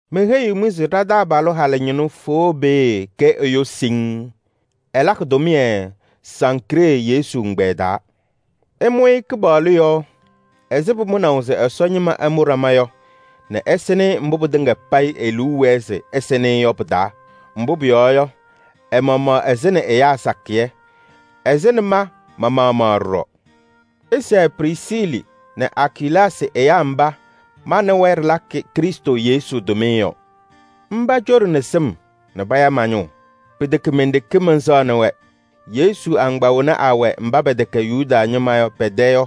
Meheyiɣ-mɩ se ɖa-taabalʋ halʋ ñɩnʋ Foobee kɛ ɛyʋ siŋŋ. Ɛlakɩ tʋmɩyɛ Sankree Yesu ɛgbɛyɛ taa. Ɩmʋ-ɩ Kɩpaɣlʋ yɔɔ ɛzɩ pʋmʋnaʋ se Ɛsɔ ñɩma ɛmʋ ɖama yɔ nɛ ɩsɩnɩ-ɩ mbʋ pɩtɩŋa payɩ e-liu wɛɛ se ɩsɩnɩ-ɩ yɔ pɩ-taa. Mbʋ pʋyɔɔ yɔ, ɛ-maɣmaɣ ɛsɩnɩ ɛyaa sakɩyɛ, ɛsɩnɩ ma-maɣmaɣ ɖɔɖɔ. Ɩsɛɛ Prisiili nɛ Akilaasɩ mba ma nɛ wɛ ɖɩlakɩ Krɩstʋ Yesu tʋmɩyɛ yɔ. Mba coɖini sɩm nɛ paya ma-ñʋʋ. Pɩtɛkɛ men-ɖeke mɛnsɛɣnɩ-wɛ, Yesu agbaa wena awɛ mba pɛtɛkɛ Yuda ñɩma yɔ pɛ-tɛ yɔ,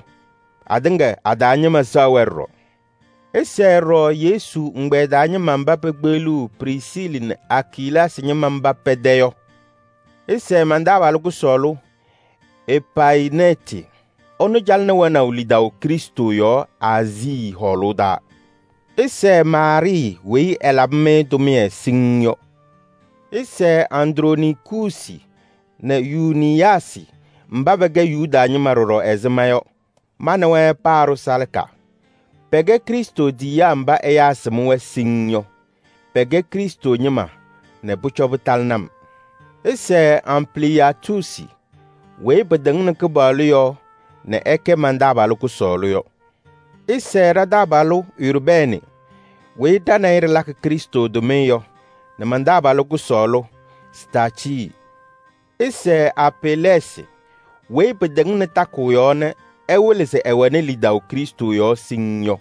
atɩŋa a-taa ñɩma sɛɣ-wɛ ɖɔɖɔ. Ɩsɛɛ ɖɔɖɔ Yesu ɛgbɛyɛ taa ñɩma mba pekpeɣliɣ Prisiili nɛ Akilaasɩ mba pɛ-tɛ yɔ. Ɩsɛɛ man-taabalʋ kʋsɔɔlʋ Epayɩnɛɛtɩ. Ɛnʋ calɩnɩ wɛnaʋ lidaʋ Krɩstʋ yɔɔ Aazii hɔɔlʋʋ taa. Ɩsɛɛ Maarɩɩ weyi ɛlabɩ-mɩ tʋmɩyɛ siŋŋ yɔ. Ɩsɛɛ Andronikuusi nɛ Yuuniyaasɩ mba pɛkɛ Yuda ñɩma ɖɔɖɔ ɛzɩ ma yɔ. Ma nɛ wɛ paaɖʋ salaka. Pɛkɛ Krɩstʋ tiyiyaa mba ɛyaa sɩm-wɛ siŋŋ yɔ. Pɛkɛ Krɩstʋ ñɩma nɛ pʋcɔ pɩtalɩnɩ-m. Ɩsɛɛ Ampliyaatuusi weyi pɩtɩŋnɩ Kɩpaɣlʋ yɔɔ nɛ ɛkɛ man-taabalʋ kʋsɔɔlʋ yɔ. Ɩsɛɛ ɖa-taabalʋ Urbɛɛnɩ weyi ɖa nɛ ɩ ɖɩlakɩ Krɩstʋ tʋmɩyɛ yɔ nɛ man-taabalʋ kʋsɔɔlʋ Staacɩɩ. Ɩsɛɛ Apelɛɛsɩ weyi pɩtɩŋnɩ takʋʋ yɔɔ nɛ ɛwɩlɩ se ɛwɛnɩ lidaʋ Krɩstʋ yɔɔ siŋŋ yɔ.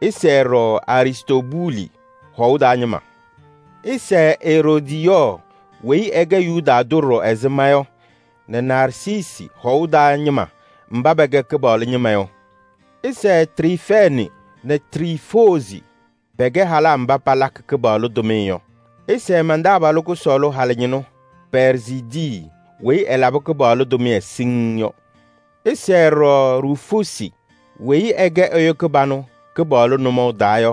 Ɩsɛɛ ɖɔɖɔ Aristoobuuli hɔʋ taa ñɩma. Ɩsɛɛ Eroodiyɔɔ weyi ɛkɛ Yuda tʋ ɖɔɖɔ ɛzɩ ma yɔ nɛ Narsiisi hɔʋ taa ñɩma mba pɛkɛ Kɩpaɣlʋ ñɩma yɔ. Ɩsɛɛ Triifɛɛnɩ nɛ Triifoozi. Pɛkɛ halaa mba palakɩ Kɩpaɣlʋ tʋmɩyɛ yɔ. Ɩsɛɛ man-taabalʋ kʋsɔɔlʋ halʋ ñɩnʋ Pɛɛrzidii weyi ɛlabɩ Kɩpaɣlʋ tʋmɩyɛ siŋŋ yɔ. Ɩsɛɛ ɖɔɖɔ Ruufuusi weyi ɛkɛ ɛyʋ kɩbanʋ Kɩpaɣlʋ nʋmɔʋ taa yɔ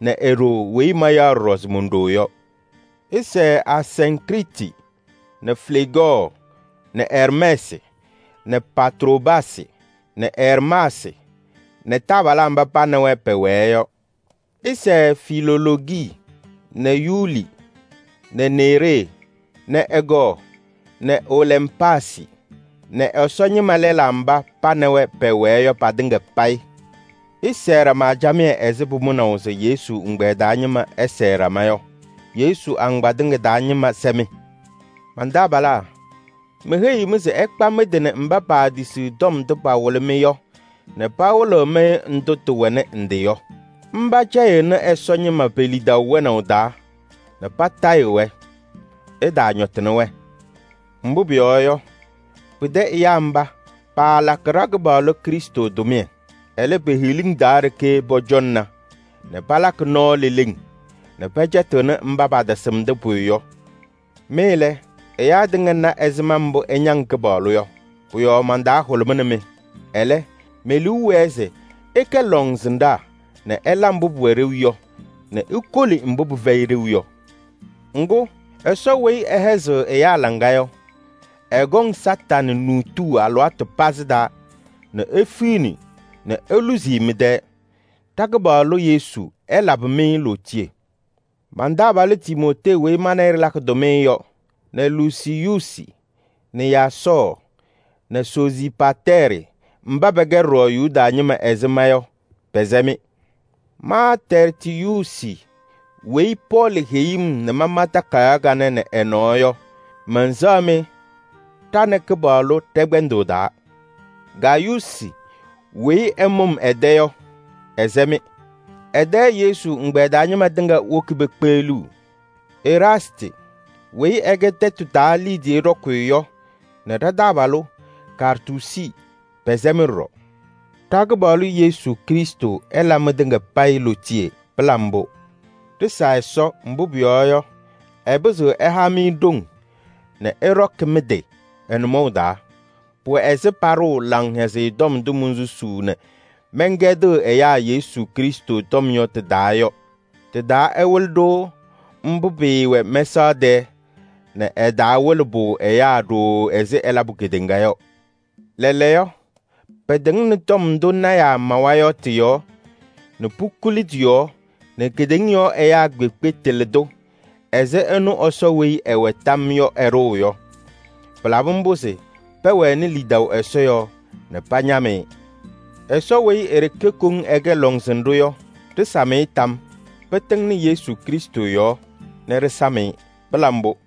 nɛ e-ɖoo weyi mayaɣ ɖɔɖɔ se mon-ɖoo yɔ. Ɩsɛɛ Asiŋkriiti nɛ Fleegɔɔ nɛ Ɛrmɛɛsɩ nɛ Patroobaasɩ nɛ Ɛrmaasɩ nɛ taabalaa mba pa nɛ wɛ pɛwɛɛ yɔ. Ɩsɛɛ Filoloogi nɛ Yuuli nɛ Neeree nɛ ɛ-kɔɔ nɛ Olɛmpaasɩ nɛ Ɛsɔ ñɩma lɛlaa mba pa nɛ wɛ pɛwɛɛ yɔ patɩŋa payɩ. Ɩsɛɛ ɖama camɩyɛ ɛzɩ pʋmʋnaʋ se Yesu ɛgbɛyɛ taa ñɩma ɛsɛɛ ɖama yɔ. Yesu agbaa tɩŋa taa ñɩma sɛ-mɩ. Man-taabalaa, meheyiɣ-mɩ se ɩkpa mɩ-tɩ nɛ mba paatisiɣ tɔm ndʋ pawɩlɩ-mɩ yɔ nɛ pawɩlɩɣ-mɩ ndʋ tɩwɛnɩ ndɩ yɔ. Mba cɛyɩɣnɩ Ɛsɔ ñɩma pe-lidaʋ wɛnaʋ taa nɛ patayɩɣ-wɛ. Ɩtaañɔtɩnɩ-wɛ. Mbʋ pʋyɔɔ yɔ, pɩtɛ ɛyaa mba, paalakɩ ɖa-Kɩpaɣlʋ Krɩstʋ tʋmɩyɛ. Ɛlɛ, pe-hiliŋ taa ɖeke pɔcɔŋna nɛ palakɩ nɔɔ leleŋ nɛ pɛcɛtɩɣnɩ mba patasɩmdɩ pʋyʋ yɔ. Mɩ lɛ, ɛyaa tɩŋa na ɛzɩma mbʋ ɩñaŋ Kɩpaɣlʋ yɔ. Pʋ-yɔɔ man-taa hʋlʋmɩnɩ-mɩ. Ɛlɛ, me-liu wɛɛ se ɩkɛ lɔŋsɩnɖaa nɛ ɩla mbʋ pʋwɛ ɖeu yɔ nɛ ikoli mbʋ pɩfɛyɩ ɖeu yɔ. Ŋgʋ, Ɛsɔ weyi ɛhɛzɩɣ ɛyaa laŋa yɔ, ɛkɔŋ Satanɩ nuutuu alɩwaatʋ pazɩ taa nɛ efiɣni nɛ eluzi-i mɩ-tɛɛ. Ɖa-Kɩpaɣlʋ Yesu ɛlabɩ-mɩ lootiye. Man-taabalʋ Timootee weyi ma nɛ ɩ ɖɩlakɩ tʋmɩyɛ yɔ nɛ Lusiyuusi nɛ Yaasɔɔ nɛ Soziipatɛɛrɩ mba pɛkɛ ɖɔɖɔ Yuda ñɩma ɛzɩ ma yɔ, pɛsɛ-mɩ. Ma Tɛrtiyuusi weyi Pɔɔlɩ heyi-m nɛ mama takayaɣ kanɛ nɛ ɛ-nɔɔ yɔ, mɛnsɛɣ-mɩ ɖa nɛ Kɩpaɣlʋ ɖɛ-kpɛndʋʋ taa. Gayuusi weyi ɛmʋ-m ɛ-tɛ yɔ, ɛsɛ-mɩ. Ɛ-tɛ Yesu ɛgbɛyɛ taa ñɩma tɩŋa woki pekpeɣliɣ. Eraastɩ weyi ɛkɛ tɛtʋ taa liidiye ɖɔkɩyʋ yɔ nɛ ɖa-taabalʋ Kaartuusi pɛsɛ-mɩ ɖɔɖɔ. [ Ɖa-Kɩpaɣlʋ Yesu Krɩstʋ ɛla mɩtɩŋa payɩ lootiye. Pɩla mbʋ!] Ɖɩsa Ɛsɔ, mbʋ pʋyɔɔ yɔ, ɛpɩzɩɣ ɛha-mɩ ɖoŋ nɛ ɩɖɔkɩ mɩ-tɩ ɛ-nʋmɔʋ taa. Pʋwɛ ɛzɩ paɖʋʋ Laŋhɛzɩyɛ Tɔm ndʋ monsusuu nɛ mɛnkɛdɩɣ ɛyaa Yesu Krɩstʋ tɔm yɔ tɩ-taa yɔ. Tɩ-taa ɛwɩlɩ-ɖʋ mbʋ pɩɩwɛ mɛsaɣ tɛɛ nɛ ɛtaawɩlɩ-pʋ ɛyaa ɖooo ɛzɩ ɛlabʋ kedeŋa yɔ. Lɛɛlɛɛyɔ pɩtɩŋnɩ tɔm ndʋ lɔɔyɩsɩ tɩnaa mawa yɔ tɩ-yɔɔ nɛ pukuli tɩ-yɔɔ nɛ kedeŋa yɔɔ ɛyaa kpeekpe tɩlɩ-tʋ ɛzɩ ɛnʋ Ɛsɔ weyi ɛwɛ tam yɔɔ yɔ ɛɖʋʋ yɔ. Pɩlabɩ mbʋ se pɛwɛnɩ lidaʋ Ɛsɔ yɔɔ nɛ pañam-ɩ. Ɛsɔ weyi e-ɖeke koŋ ɛkɛ lɔŋsɩnɖʋ yɔ, ɖɩsam-ɩ tam yɔɔ. Pɩtɩŋnɩ Yesu Krɩstʋ yɔɔ nɛ ɖɩsam-ɩ. Pɩla mbʋ!